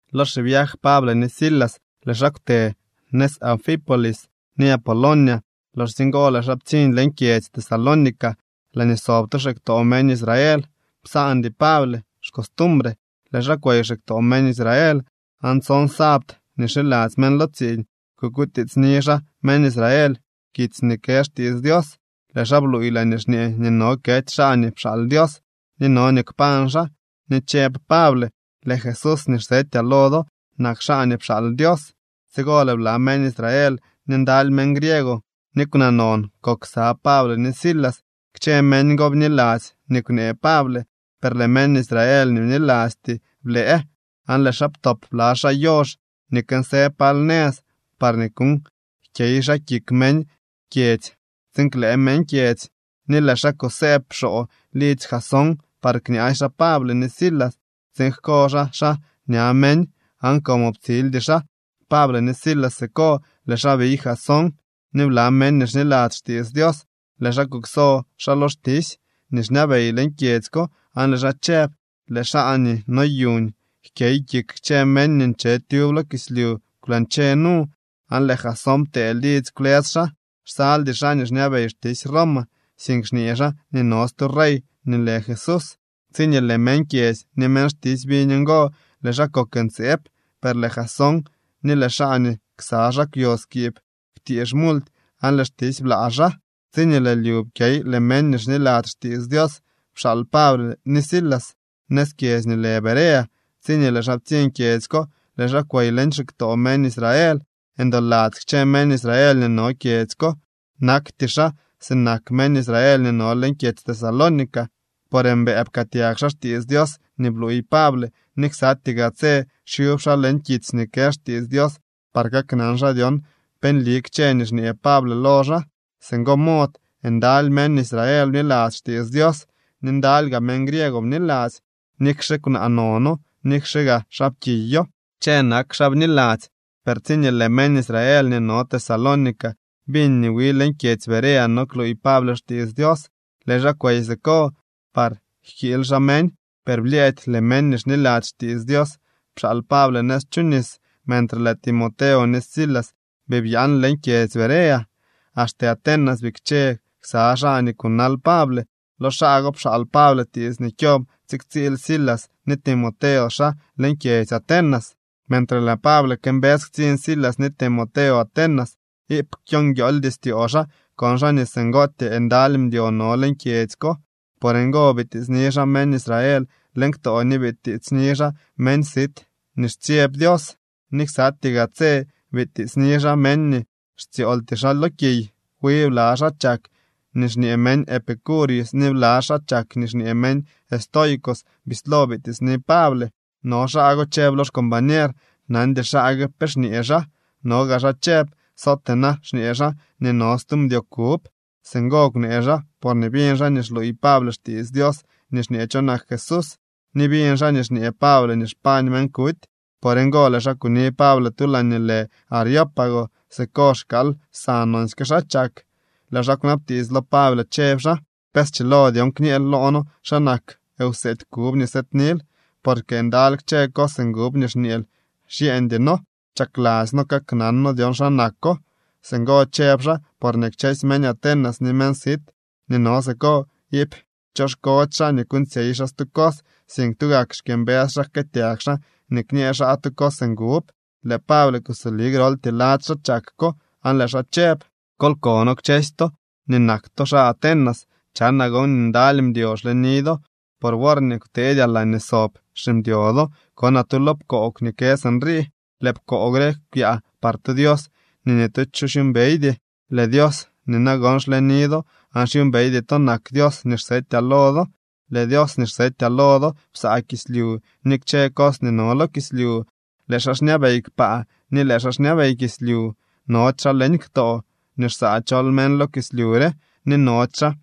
Lo xiviaj Pable ni Silas, lëë xaa kwte nëz Anfípolis ni Apolonia. Loxsye ngo lëë xaa ptsiñ leñ kyedzy Tesalónica laañee sob tu xiktoo meñ Israel. Psaandy Pable xcostumbre, lëë xaa kwey xiktoo meñ Israel, aan tson sabt nii xiladzy meñ lo tsiiñ kukutiitsni xaa meñ Israel kitsy nii kë xtiits Dios. Lëë xaa bluuy laañee xñee nii no kety xaa nii pxaal Dios, ni no nii kpañ xaa, ni chëb Pable: —Lëë Jesús nii xsetyaa lo do nak xaa nii pxaal Dios. Tsigo lëë bla meñ Israel ni ndaly meñ griego ni kwnaa non kok ksa Pable ni Silas. Kchë meñ go bniladzy nii kwnee Pable. Per lëë meñ Israel nii bnilasty blëë aan lëë xaa ptop bla xaa yox nii kënsë pal nëz parñee kuuñ jkyey xaa kik meñ kyedzy tsiin klëë meñ kyedzy. Ni lëë xaa kusëëb xoo lidzy Jasón par kñaasy xaa Pable ni Silas tsiin jko xaa xaa ña meñ. Aan como ptsildy xaa Pable ni Silas siko, lëë xaa biy Jasón ni bla meñ nii xniladzy xtiits Dios. Lëë xaa kukso xaa lo xtisy nii xñabey leñ kyedzy ko, aan lëë xaa chëb: —Lëë xaa nii noyuuñ jkyey kik kchë meñ nii nche tyub lo kislyu kwlañche nu, aan lëë Jasón ptee lidzy kwlës xaa. Xsaldy xaa nii xñabey xtisy Roma, sink xñee xaa nii no stu rey nii lë Jesús. Tsiñee lëë meñ kyedzy ni meñ xtisy biñ ngo, lëë xaa kok ntseeb. Per lëë Jasón ni lëë xaa nii ksa xaa kwyo skiib kwtiix multy aan lëë xtisy blaa xaa. Tsiñee lëë lyu pkyey, lëë meñ nii xniladzy xtiits Dios pxaal Pable ni Silas nëz kyedzy nii lë Berea. Tsiñee lëë xaa ptsiñ kyedzy ko, lëë xaa kwey leñ xiktoo meñ Israel. Ndoladzy kchë meñ Israel nii no kyedzy ko. Nakty xaa sinak meñ Israel nii no leñ kyedzy Tesalónica, por mbëë pkëëtyag xaa xtiits Dios nii bluuy Pable ni ksatyee gaa tse xyub xaa leñ kitsy nii kë xtiits Dios par kaknan xaa dyon pe nli kchë nii xñee Pable lo xaa. Singo mod ndaly meñ Israel bniladzy xtiits Dios, ni ndaly gaa meñ griego bniladzy. Nikxe kwnaa nono, nikxe gaa xaapkiyo, kchë nak xaa bniladzy. Per tsiñee lëë meñ Israel nii no Tesalónica biñ nii wi leñ kyedzy Berea no kluuy Pable xtiits Dios, lëë xaa kwey siko par jkiily xaa meñ. Per blyëëdy lëë meñ nii xniladzy xtiits Dios pxaal Pable nëz chu nis, mentre lëë Timoteo ni Silas bii byaan leñ kyedzy Berea. Axte Atenas bikche ksa xaa nii kunal Pable. Lo xaa go pxaal Pable tiits nii kyob tsiktsiil Silas ni Timoteo xaa leñ kyedzy Atenas. Mentre lëë Pable këmbës ktsiñ Silas ni Timoteo Atenas, iip kwyonguiooldy styoo xaa kon xaa nii singootyee ndaly mdyo no leñ kyedzy ko. Por ngo bitiitsni xaa meñ Israel leñ ktoo ni bitiitsni xaa meñ sit nii xtsyeb Dios, ni ksatyee gaa tse bitiitsni xaa meñ nii xtsyooltyee xaa lo kiy. Wi bla xaa chak nii xñee meñ Epicúreos ni bla xaa chak nii xñee meñ Estoicos bislo bitiitsni Pable. No xaa go chëb lo xcombañer: —Nandy xaa gue pe xñee xaa. No gaa xaa chëb: —Sootee na xñee xaa nii no stu mdyo kub. Singo kwnee xaa porñee biñ xaa nii xluuy Pable xtiits Dios nii xñee cho nak Jesús ni biñ xaa nii xñee Pable nii xpañ meñ kuty. Por ngo lëë xaa kuni Pable tu laañee nii lë Areópago. Siko xkaal lsa nonsyke xaa chak. Lëë xaa kwnabtiits lo Pable chëb xaa: —¿Pe schilo dyon kñëël loo noo xa nak wseedy kub nii sëëdnil? Porque ndaly kchë cos ngub nii xñeel xyeeñdy noo. Chakladzy noo kaknan noo dyon xa nako. Singo chëb xaa porñee kchësy meñ Atenas ni meñ sit nii no siko iip choxkody xaa nii kuuñtsyey xaa stu cos, sink tugak xkyëmbës xaa jkëëtyag xaa ni kñee xaa tu cos ngub. Lëë Pable kusoli groltyee lady xaa chak ko, aan lëë xaa chëb: —Kol kono kchësy to nii nak to xaa Atenas, chanaa gon nii ndaly mdyo xleni do. Por worñee kwteedyaa laañee sob ximdyo do, konaa tu lo pkoog nii kë sinrii: “Lëë pkoog re kwyaa par tu Dios nii ni tu cho xyuumbeydy.” Lëë Dios nii nagon xleni do aan xyuumbeydy to nak Dios nii xsetyaa lo do. ’Lëë Dios nii xsetyaa lo do psaa kislyu ni kchë cos nii no lo kislyu. Lëë xaa xñabey kpaa ni lëë xaa xñabey kislyu. Nody xaa leñ ktoo nii xsaa chol meñ lo kislyu re, ni nody xaa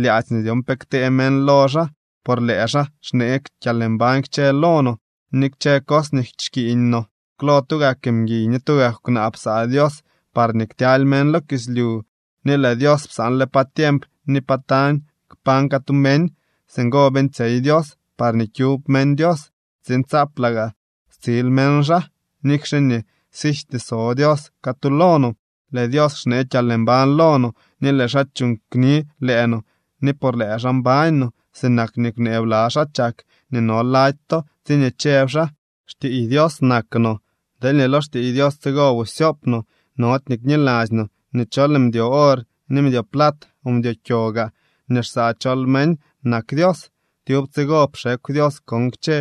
lyaadzy nii dyon pe ktee meñ lo xaa, por lëë xaa xnee kyalmbañ kchë lo no, ni kchë cos nii xkiiñ no. ’Klo tugak mguiy ni tugak kwnaa psaa Dios parñee ktyaly meñ lo kislyu. Ni lëë Dios psaanle pa tiemp ni pa tañ kpañ catu meñ. Singo beeñtsyey Dios parñee kyub meñ Dios, tsiin tsaaplaa gaa stsil meñ xaa, nikxe nii sijty so Dios catu lo no. Lëë Dios xnee kyalmbañ lo no, ni lëë xaa chuuñ kni lëë no, ni por lëë xaa mbañ no, sinak nii kwnee bla xaa chak nii no lady to, tsiñee chëb xaa: “Xtiiy Dios nak no.” Deelñee lo xtiiy Dios tsigo busy syoop no, nody nii kniladzy no nii chol mdyo or ni mdyo plat o mdyo kyo gaa nii xsaa chol meñ nak Dios. Tyub tsigo pxekw Dios kon kchë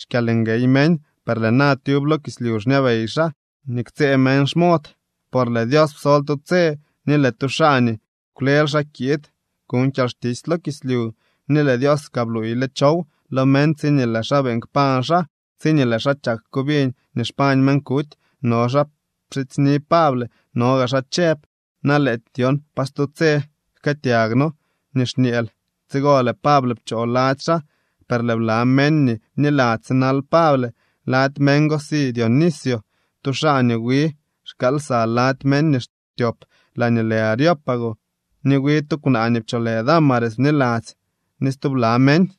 xkyalnguey meñ, per lëë na tyub lo kislyu xñabey xaa nii ktsëë meñ xmod. Por lëë Dios psol tu tse nii lëë tu xaa nii kwlel xaa kiid kuñ kyalxtisy lo kislyu, ni lëë Dios kaa bluuyle chow lo meñ tsiñee lëë xaa beeñ kpañ xaa. Tsiñee lëë xaa chak ko biñ nii xpañ meñ kuty, no xaa pxidzyni Pable, no gaa xaa chëb: —Na lëëty dyon pa stu tse jkëëtyag noo nii xñeel. Tsigo lëë Pable pchoo lady xaa. Per lëë bla meñ nii bniladzy sinal Pable. Lady meñ go si Dionisio, tu xaa nii wi xkaal lsa lady meñ nii xtyop laañee lë Areópago. Ni wi tu kwnaa nii pcholë Dámaris bniladzy ni stubla meñ.